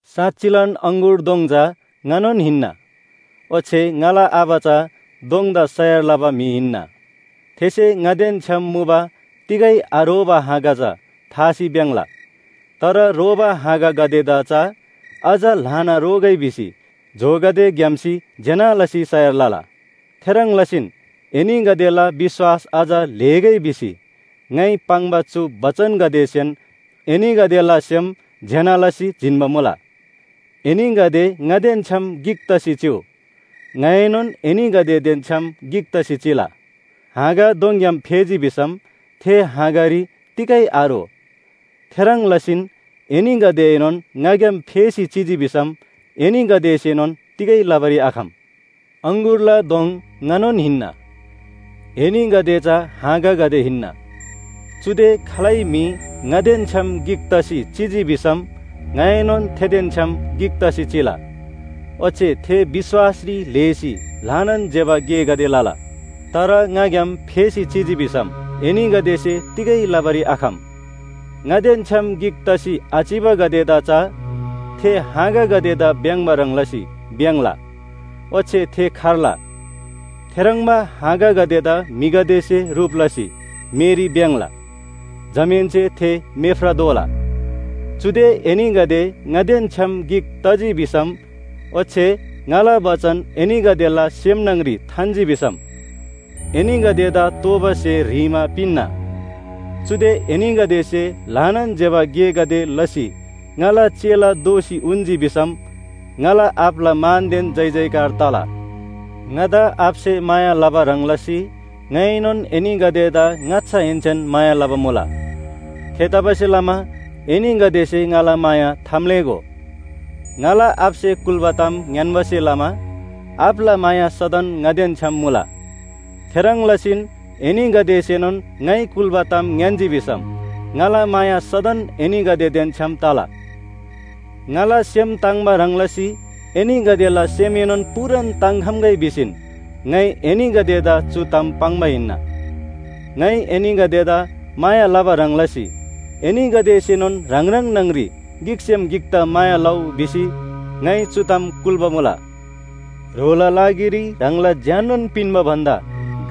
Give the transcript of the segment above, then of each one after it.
“साँच्‍चिलान अङगुर दोङ चा ङानोन हिन्‍ना, ओच्‍छे ङाला आबा चा दोङदा सयार लबा म्‍हि हिन्‍ना। थेसे ङादेन छ्‌याम मुबा तिगै आरोबा हाँगा चा थासी भ्‍याङ्‍ला। तर रोबा हाँगागदेदा चा अझ ल्‍हाना रोगै भिसी जोगदे घ्‍याम्‍सी ज्‍यना लसी सयार लला। थेह्रङ् लसीन एनीगदेला विश्‍वास अझ ल्‍हेगै भिसी ङाइ पाङ्बा चु बचनगदेसेन एनीगदेला सेम ज्‍यना लसी जिन्‍बा मुला। एनीगदे ङादेन छ्‌याम गिक तसी चिउ, ङाएनोन एनीगदेदेन छ्‌याम गिक तसी चिला। हाँगा दोङग्‍याम फेजी भिसम थे हाँगारी तिगै आरो। थेह्रङ् लसीन एनीगदेएनोन ङाग्‍याम फेसी चिजी भिसम एनीगदेसेनोन तिगै लबारी आखम। “अङगुरला दोङ ङानोन हिन्‍ना, एनीगदे चा हाँगागदे हिन्‍ना। चुदे खालै म्‍हि ङादेन छ्‌याम गिक तसी चिजी भिसम ङाएनोन थेदेन छ्‌याम गिक तसी चिला, ओच्‍छे थे विश्‍वासरी ल्‍हेसी ल्‍हानान ज्‍यबा गेगदे लला। तर ङाग्‍याम फेसी चिजी भिसम एनीगदेसे तिगै लबारी आखम। ङादेन छ्‌याम गिक तसी आचिबागदेदा चा थे हाँगागदेदा भ्‍याङ्‍बा ह्रङ् लसी भ्‍याङ्‍ला, ओच्‍छे थे खर्ला। थेह्रङ्बा हाँगागदेदा म्‍हिगदेसे ह्रुप लसी मेरी भ्‍याङ्‍ला, जमाहेन्‍से थे मेफ्रा दोला। चुदे एनीगदे ङादेन छ्‌याम गिक तजी भिसम ओच्‍छे ङाला बचन एनीगदेला सेम न्‍हङ‍री थान्‍जी भिसम एनीगदेदा तोःबा स्‍हे ह्रीमा पिन्‍ना। चुदे एनीगदेसे ल्‍हानान ज्‍यबा गेगदे लसी ङाला चेला दोसी उन्‍जी भिसम ङाला आबाला मानदेन जयजयकार तला। “ङादा आबासे माया लबा ह्रङ् लसी ङाइएनोन एनीगदेदा ङाच्‍छाहेन्‍सेन माया लबा मुला। थेतबासेलमा एनीगदेसे ङाला माया थाम्‍लेःगो। ङाला आबासे कुल्‍बा ताम ङ्‍यान्‍बासे लमा आबाला माया सदन ङादेन छ्‌याम मुला। थेह्रङ् लसीन एनीगदेसेनोन ङाइ कुल्‍बा ताम ङ्‌यान्‍जी भिसम ङाला माया सदन एनीगदेदेन छ्‌याम तला। ङाला सेम ताङ्‍बा ह्रङ् लसी एनीगदेला सेमएनोन पूरान ताङ्‍खम्‍गै भिसीन ङाइ एनीगदेदा चु ताम पाङ्बा हिन्‍ना। “ङाइ एनीगदेदा माया लबा ह्रङ् लसी एनीगदेसेनोन ह्राङ ह्राङ न्‍हङ‍री गिकसेम गिकदा माया लउ भिसी ङाइ चु ताम कुल्‍बा मुला। ह्रोला लागिरी ह्राङला ज्‍याननोन पिन्‍बा भन्‍दा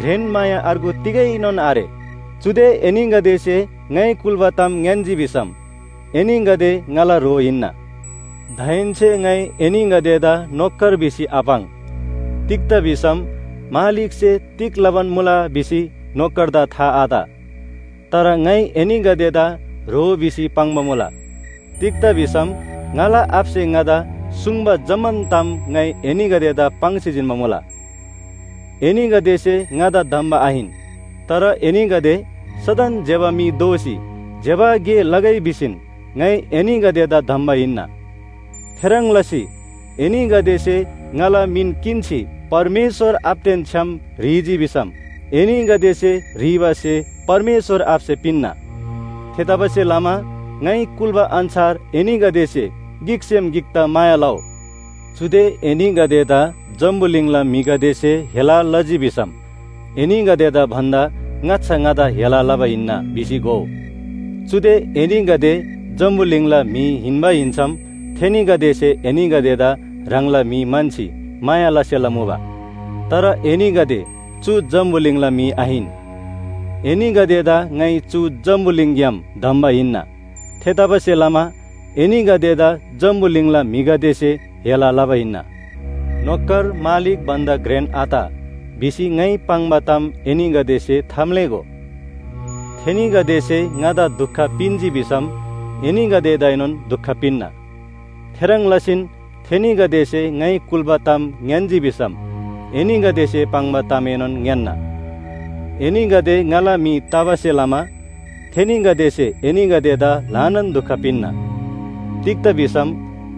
घ्रेन माया अर्गु तिगैनोन आरे। चुदे एनीगदेसे ङाइ कुल्‍बा ताम ङ्‌यान्‍जी भिसम एनीगदे ङाला ह्रो हिन्‍ना। दाहेन्‍से ङाइ एनीगदेदा नोकर भिसी आपाङ्, तिग्‍दा भिसम मालिकसे तिग लबान मुला भिसी नोकरदा था आत। तर ङाइ एनीगदेदा ह्रो भिसी पाङ्बा मुला, तिग्‍दा भिसम ङाला आबासे ङादा सुङ्बा जम्‍मान ताम ङाइ एनीगदेदा पाङ्सी जिन्‍बा मुला। एनीगदेसे ङादा धम्‍बा आहिन, तर एनीगदे सदन ज्‍यबा म्‍हि दोसी ज्‍यबा गे लगै भिसीन ङाइ एनीगदेदा धम्‍बा हिन्‍ना। थेह्रङ् लसी एनीगदेसे ङाला मिन किन्‍सी परमेश्‍वर आबादेन छ्‌याम ह्रीजी भिसम एनीगदेसे ह्रीबा स्‍हे परमेश्‍वर आबासे पिन्‍ना। थेतबासेलमा ङाइ कुल्‍बा अन्‍छार एनीगदेसे गिकसेम गिकदा माया लउ। “चुदे एनीगदेदा जम्‍बुलिङला म्‍हिगदेसे हेला लजी भिसम एनीगदेदा भन्‍दा ङाच्‍छा ङादा हेला लबा हिन्‍ना भिसी घोउ। चुदे एनीगदे जम्‍बुलिङला म्‍हि हिन्‍बा हिन्‍सम थेनीगदेसे एनीगदेदा ह्राङला म्‍हि म्‍हन्‍सी माया लसेला मुबा। तर एनीगदे चु जम्‍बुलिङला म्‍हि आहिन। एनीगदेदा ङाइ चु जम्‍बुलिङग्‍याम धम्‍बा हिन्‍ना। थेतबासेलमा एनीगदेदा जम्‍बुलिङला म्‍हिगदेसे हेला लबा हिन्‍ना। ‘नोकर मालिक भन्‍दा घ्रेन आत’ भिसी ङाइ पाङ्बा ताम एनीगदेसे थाम्‍लेःगो। थेनीगदेसे ङादा दुख पिन्‍जी भिसम एनीगदेदाएनोन दुख पिन्‍ना। थेह्रङ् लसीन थेनीगदेसे ङाइ कुल्‍बा ताम ङ्‌यान्‍जी भिसम एनीगदेसे पाङ्बा तामएनोन ङ्‌यान्‍ना। एनीगदे ङाला म्‍हि तबासे लमा थेनीगदेसे एनीगदेदा ल्‍हानान दुख पिन्‍ना। तिग्‍दा भिसम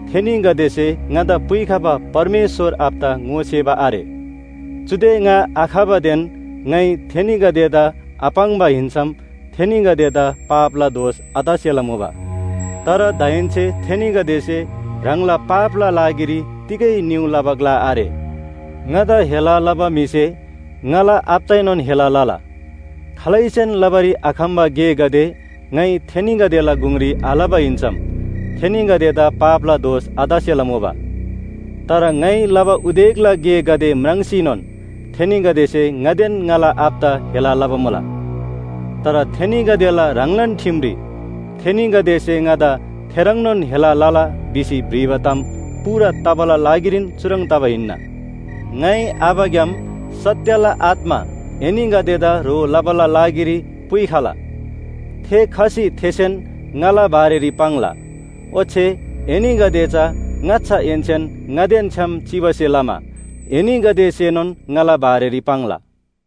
थेनीगदेसे ङादा पुइखबा परमेश्‍वर आबादा ङोसेबा आरे। चुदे ङा आखबादेन ङाइ थेनीगदेदा आपाङ्बा हिन्‍सम थेनीगदेदा पापला दोष आतसेला मुबा। तर दाहेन्‍से थेनीगदेसे ह्राङला पापला लागिरी तिगै निउ लबा ग्‍ला आरे। ङादा हेला लबा म्‍हिसे ङाला आबादाएनोन हेला लला। खालैसेन लबारी आखम्‍बा गेगदे ङाइ थेनीगदेला गुङरी आलबा हिन्‍सम थेनीगदेदा पापला दोष आतसेला मुबा। तर ङाइ लबा उदेकला गेगदे म्राङ्सीनोन थेनीगदेसे ङादेन ङाला आबादा हेला लबा मुला। तर थेनीगदेला ह्राङलान ठिमरी ‘थेनीगदेसे ङादा थेह्रङ्नोन हेला लला’ भिसी भ्रिबा ताम पूरा तबाला लागिरीन चुह्रङ् तबा हिन्‍ना। “ङाइ आबाग्‍याम सत्‍यला आत्‍मा एनीगदेदा ह्रो लबाला लागिरी पुइखला। थे खसी थेसेन ङाला बारेरी पाङ्ला। ओच्‍छे एनीगदे चा ङाच्‍छाहेन्‍सेन ङादेन छ्‌याम चिबासे लमा एनीगदेसेनोन ङाला बारेरी पाङ्ला।